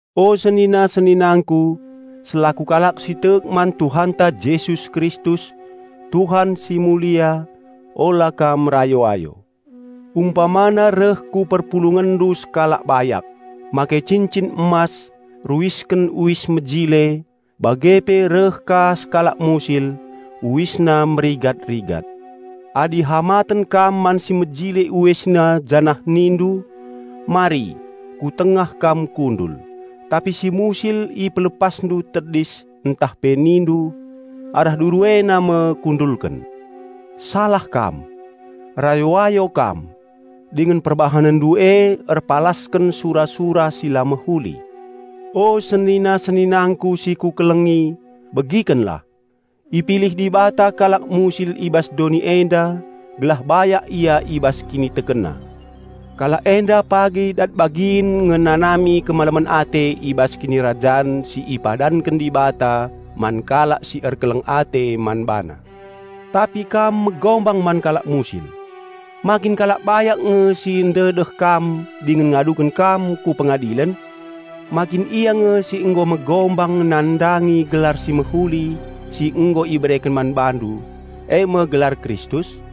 O senina-seninangku, selaku kalak si tek man Tuhanta Jesus Kristus, Tuhan Simulia, ula kam rayo-ayo. Umpamana reh ku perpulungenndu sekalak bayak, make cincin emas, ruisken uis mejile; bage pe reh ka sekalak musil, uisna merigat-rigat. Adi hamaten kam man si mejile uisna janah nindu, "Mari, ku tengah kam kundul," tapi si musil ipelepasndu tedis ntah pe nindu, "Arah duru ena me kundulken," salah kam. Rayo-ayo kam, dingen perbahanenndu e erpalasken sura-sura si la mehuli. O senina-seninangku si kukelengi, begikenlah! Ipilih Dibata kalak musil i bas doni enda gelah bayak ia i bas kinitekenna. Kalak enda pagi dat bagin ngenanami kemalemen ate i bas kinirajan si ipadanken Dibata man kalak si erkeleng ate man BaNa. Tapi kam megombang man kalak musil! Ma kin kalak bayak nge si ndedeh kam dingen ngaduken kam ku pengadilen! Ma kin ia nge si nggo megombang nandangi gelar si mehuli si nggo ibereken man bandu, e me gelar Kristus?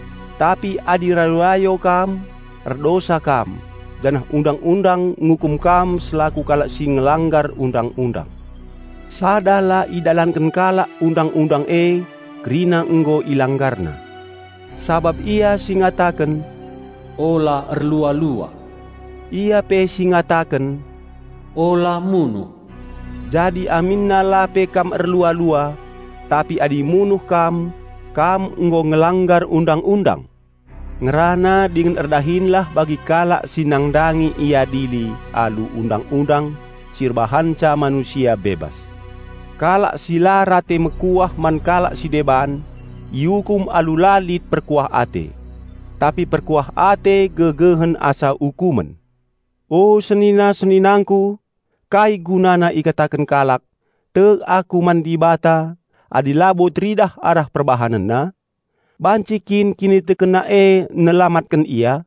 Tapi adi rayo-ayo kam, erdosa kam, janah Undang-undang ngukum kam selaku kalak si ngelanggar Undang-undang. Sada la idalanken kalak Undang-undang e, kerina nggo ilanggarna. Sabap Ia si ngataken, "Ula erlua-lua," Ia pe si ngataken, "Ula munuh." Jadi aminna la pe kam erlua-lua, tapi adi munuh kam, kam nggo ngelanggar Undang-undang. Ngerana dingen erdahinlah bagi kalak si nandangi iadili alu Undang-undang si erbahanca manusia bebas. Kalak si la rate mekuah man kalak si deban, iukum alu la lit perkuah ate. Tapi perkuah ate gegehen asa ukumen. O senina-seninangku! Kai gunana ikataken kalak, "Tek aku man Dibata," adi labo teridah arah perbahanenna? Banci kin kinitekenna e nelamatken ia?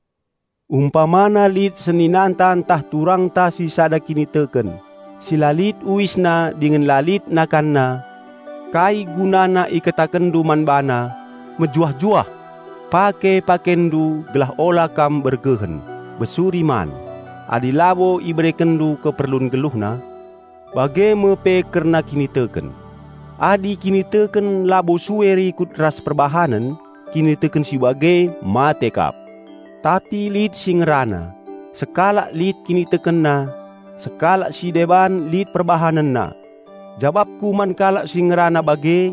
Umpamana lit seninanta ntah turangta si sada kiniteken, si la lit uisna dingen la lit nakanna, kai gunana ikatakenndu man bana, "Mejuah-juah! Pake pakenndu gelah ula kam bergehen, besuri man," adi labo iberekenndu keperlun geluhna? Bage me pe kerna kiniteken. Adi kiniteken sue labo rikut ras perbahanen, kiniteken si bage mate kap. Tapi lit si ngerana, "Sekalak lit kinitekenna, sekalak si deban lit perbahanenna." Jabapku man kalak si ngerana bage,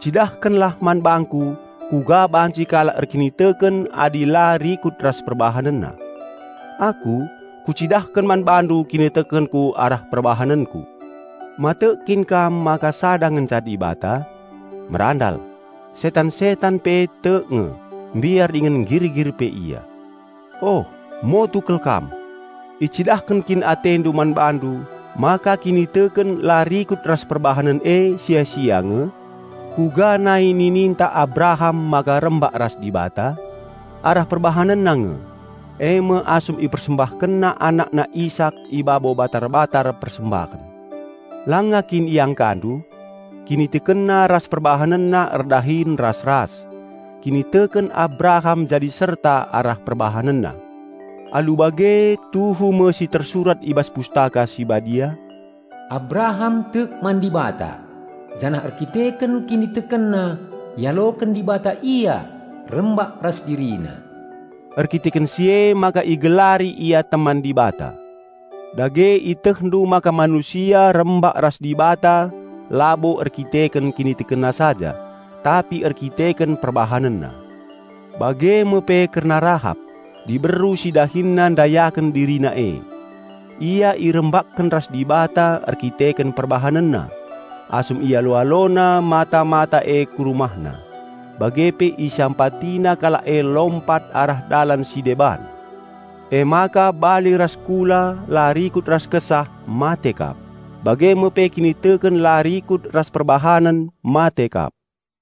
"Cidahkenlah man bangku kuga banci kalak erkiniteken adi la rikut ras perbahanenna. Aku, kucidahken man bandu kinitekenku arah perbahanenku." Ma tek kin kam maka sada ngenca Dibata? Merandal! Setan-setan pe tek nge, mbiar dingen nggirgir pe ia. Oh, motu kal kam! Icidahken kin atendu man bandu maka kiniteken la rikut ras perbahanen e sia-sia nge? Kuga nai nininta Abraham maka rembak ras Dibata? Arah perbahanenna nge; e me asum ipersembahkenna anakna Isak i babo batar-batar persembahen. Langa kin iangkandu? Kinitekenna ras perbahanenna erdahin ras-ras. Kiniteken Abraham jadi serta arah perbahanenna. Alu bage tuhu me si tersurat i bas Pustaka Si Badia, "Abraham tek man Dibata, janah erdandanken kinitekenna ialoken Dibata ia rembak ras DiriNa." Erdandanken si emaka igelari ia teman Dibata. Dage ietehndu maka manusia rembak ras Dibata labo erdandanken kinitekenna saja, tapi erdandanken perbahanenna. Bage me pe kerna Rahap, diberu si dahinna ndayaken dirina e. Ia irembakken ras Dibata erdandanken perbahanenna, asum ialo-alona mata-mata e ku rumahna, bage pe isampatina kalak e lompat arah dalan si deban. Emaka bali ras kula la rikut ras kesah mate kap, bage me pe kiniteken la rikut ras perbahanen mate kap.